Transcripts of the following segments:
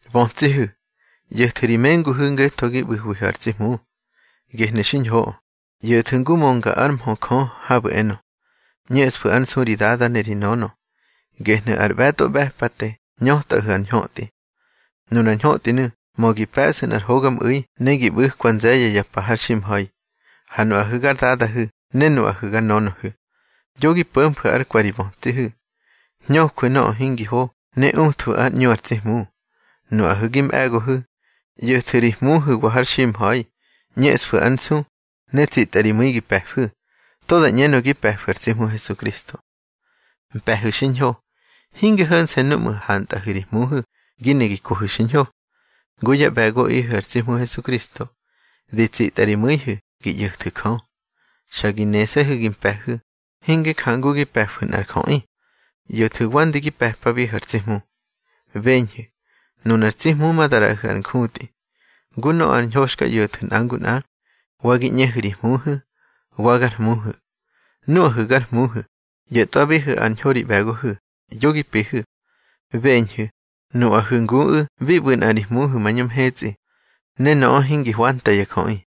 Bötsihu̱, ꞌyo̱thu̱ ri menguhu̱ ngetho gi ꞌbu̱hwihu̱ ar tsi Hmu. Gehnu̱ xiñhoꞌö. ꞌYo̱thu̱ ngu mönga ár mhö Jö habu̱ enö: ꞌÑeꞌsfu̱ ár nsu ri dada ne ri nönö, gehnu̱ ar ꞌbe̱tꞌo ꞌbe̱pate ñötꞌahu̱ ar ñhötꞌi. Nunar ñhötꞌinu̱ mö gi pe̱ꞌsa nꞌar hogamꞌu̱i ne gi ꞌbu̱kwa nze̱ye̱ ya pa har ximha̱i. Ha nuꞌahu̱ gar dadahu̱ ne nuꞌahu̱ gar nönöhu̱, yo gi po̱mfu̱ ár kwe̱ ri bötsihu̱. Hñöjwu̱ nöꞌö hingi ho ne uthwu̱ ár ꞌñu ar tsi Hmu. Nuꞌahu̱ gi mꞌe̱gohu̱, ꞌyo̱thu̱ ri hmuhu̱wa har ximha̱i. ꞌÑeꞌsfu̱ ár nsu, ne tsitꞌa ri mu̱i gi pe̱fu̱, to da ꞌñenö gi pe̱fu̱ ar tsi Hmu Hesukristo. Mpe̱hu̱ xiñho, hinge ho̱nse̱ núꞌmu̱ hantꞌahu̱ ri hmuhu̱ gi ne gi kohu̱ xiñho. Ngu yá ꞌbe̱goꞌihu̱ ar tsi Hmu Hesukristo, di tsitꞌa ri mu̱ihu̱ gi ꞌyo̱thu̱ Jö. Xa gi nese̱hu̱ gi mpe̱hu̱, hinge jangu gi pe̱fu̱ nꞌar jöꞌi, ꞌyo̱thu̱ wande gi pe̱pabihu̱ ar tsi Hmu. Beñhu̱, nunar tsi Hmu ma da ꞌraꞌahu̱ ar njutꞌi, ngu nöꞌö ar ñho xka ꞌyo̱thu̱ nꞌa ngu nꞌa, wa gi ꞌñehu̱ ri hmuhu̱, wa gar hmuhu̱. Nuꞌahu̱ gar hmuhu̱, ꞌyo̱tꞌwabihu̱ ar ñho ri ꞌbe̱gohu̱, yo gi pihu̱. Beñhu̱, nuꞌahu̱ nguꞌu̱ bi ꞌbu̱ nꞌa ri Hmuhu̱ mañö mhetsꞌi, ne nöꞌö hingi hwanta ya jöꞌi.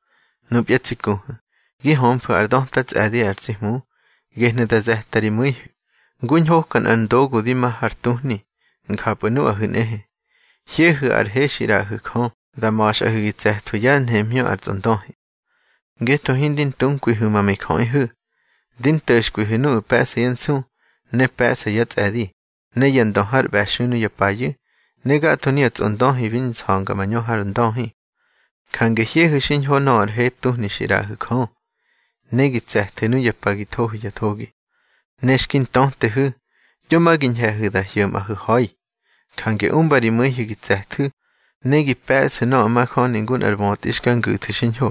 Nupya tsi kuhu̱, gi hömfu̱ ár döta tsꞌe̱di ar tsi Hmu, gehnu̱ da ze̱tꞌa ri mu̱ihu̱. Ngu ñhoka nꞌar ndogu di ma har tuhni, njapꞌu̱ nuꞌahu̱ nꞌehe, hyehu̱ ar he xi ꞌraꞌahu̱ Jö, da ma̱xꞌahu̱ gi tse̱thwu̱ yá nhemhñö ar tsꞌondöhi. Ngetho hindi ntunkwihu̱ ma mijöꞌihu̱. Di nto̱xkwihu̱ nuꞌu̱ pe̱ꞌsa yá nsu, ne pe̱ꞌsa yá tsꞌe̱di, ne ya ndö har ꞌbe̱xui nuya payu̱, ne gatho nuya tsꞌondöhi bi nsa̱nga mañö har ndöhi. Jange hyehu̱ xiñho nöꞌö ar he tuhni xi ꞌraꞌahu̱ Jö, ne gi tse̱thu̱ nuya pa gi thohu̱ ya thogi. Ne xki ntötehu̱, yo ma gi ñhe̱hu̱ da hyo̱mꞌahu̱ ha̱i. Jange umba ri mu̱ihu̱ gi tse̱thu̱, ne gi pe̱ꞌsu̱ nöꞌö majöni ngu nꞌar bötꞌi xka ngu̱thu̱ xiñho,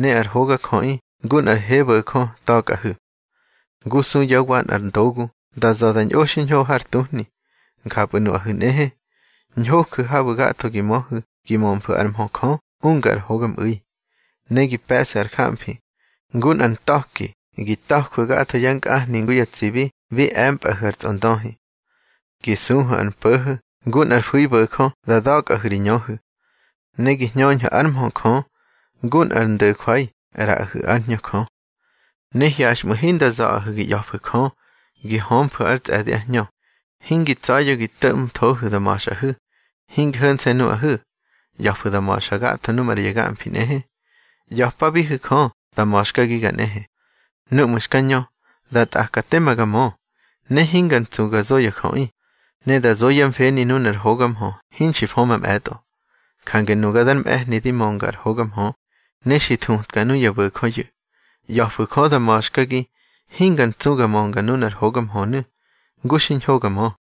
ne ar hogajöꞌi ngu nꞌar hebo̱jö ta̱kꞌahu̱. Ngu su yá wa nꞌar ndogu da za̱ da ñꞌo xiñho har tuhni, njapꞌu̱ nuꞌahu̱ nꞌehe, ñhoju̱ habu̱ gatho gi möhu̱ gi mömfu̱ ár mhö Jö unga ar hogamꞌu̱i. Ne gi pe̱ꞌsu̱ ar jamfi, ngu nꞌar ntha̱ki gi ta̱jwu̱ gatho yá nkꞌahni ngu ya tsibi bi e̱mpꞌahu̱ ar tsꞌondöhi. Gi suhu̱ ar mpo̱ho̱, ngu nꞌar fu̱ibo̱jö da da̱kꞌahu̱ ri ñöhu̱. Ne gi hñöhu̱ ár mhö Jö, ngu nꞌar ndo̱jwai ꞌraꞌahu̱ ár Hñö Jö. Ne hyaxꞌmu̱ hinda za̱ꞌahu̱ gi ꞌya̱fu̱ Jö gi hömfu̱ ár tsꞌe̱di ár Hñö. Hingi tsa̱ya̱ gi to̱ꞌmthohu̱ da ma̱xꞌahu̱. Hinge ho̱nse̱ nuꞌahu̱, ꞌya̱fu̱ da ma̱xa gatho nu maꞌra ya gamfi nꞌehe. ꞌYa̱pabihu̱ Jö da ma̱xkagiga nꞌehe. Núꞌmu̱ xka ñö, da tꞌaka tema ga mö. Ne hinga ntsu ga zo ya jöꞌi, ne da zo yá mfeni nunar hoga mhö hinxki fö mamꞌe̱tꞌo. Jange nuga dar mꞌe̱hni di mönga ar hoga mhö, ne xi thutka nuya bo̱jöyu̱. ꞌYa̱fu̱ Jö da ma̱xkagi hinga ntsu ga mönga nunar hoga mhönu̱, ngu xiñho ga ñö.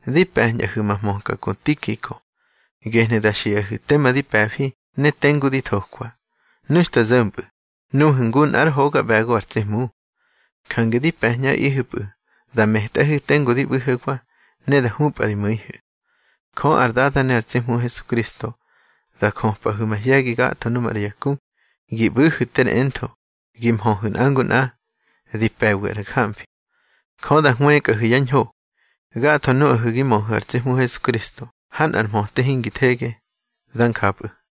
Di pe̱ñꞌahu̱ ma hmöka ku Tikiko, gehnu̱ da xiꞌahu̱ tema di pe̱fi ne tengu di thokwa. Nu xta zo̱mpꞌu̱, nuhu̱ ngu nꞌár hoga ꞌbe̱go ar tsi Hmu. Jange di pe̱ñꞌaꞌihu̱pꞌu̱ da metꞌahu̱ tengu di ꞌbu̱hewa, ne da hupꞌa ri mu̱ihu̱. Jö ar Dada ne ar tsi Hmu Hesukristo da jöpꞌahu̱ mahye̱gi gatho nu maꞌra ya ku, gi ꞌbu̱hu̱ ter entho, gi mhöhu̱ nꞌa ngu nꞌa, di pe̱wi ar jamfi. Jö da hwëkꞌahu̱ yá ñho, gatho nuꞌahu̱ gi möhu̱ ar tsi Hmu Hesukristo ha nꞌar mhöte hingi thege. Dá njapꞌu̱.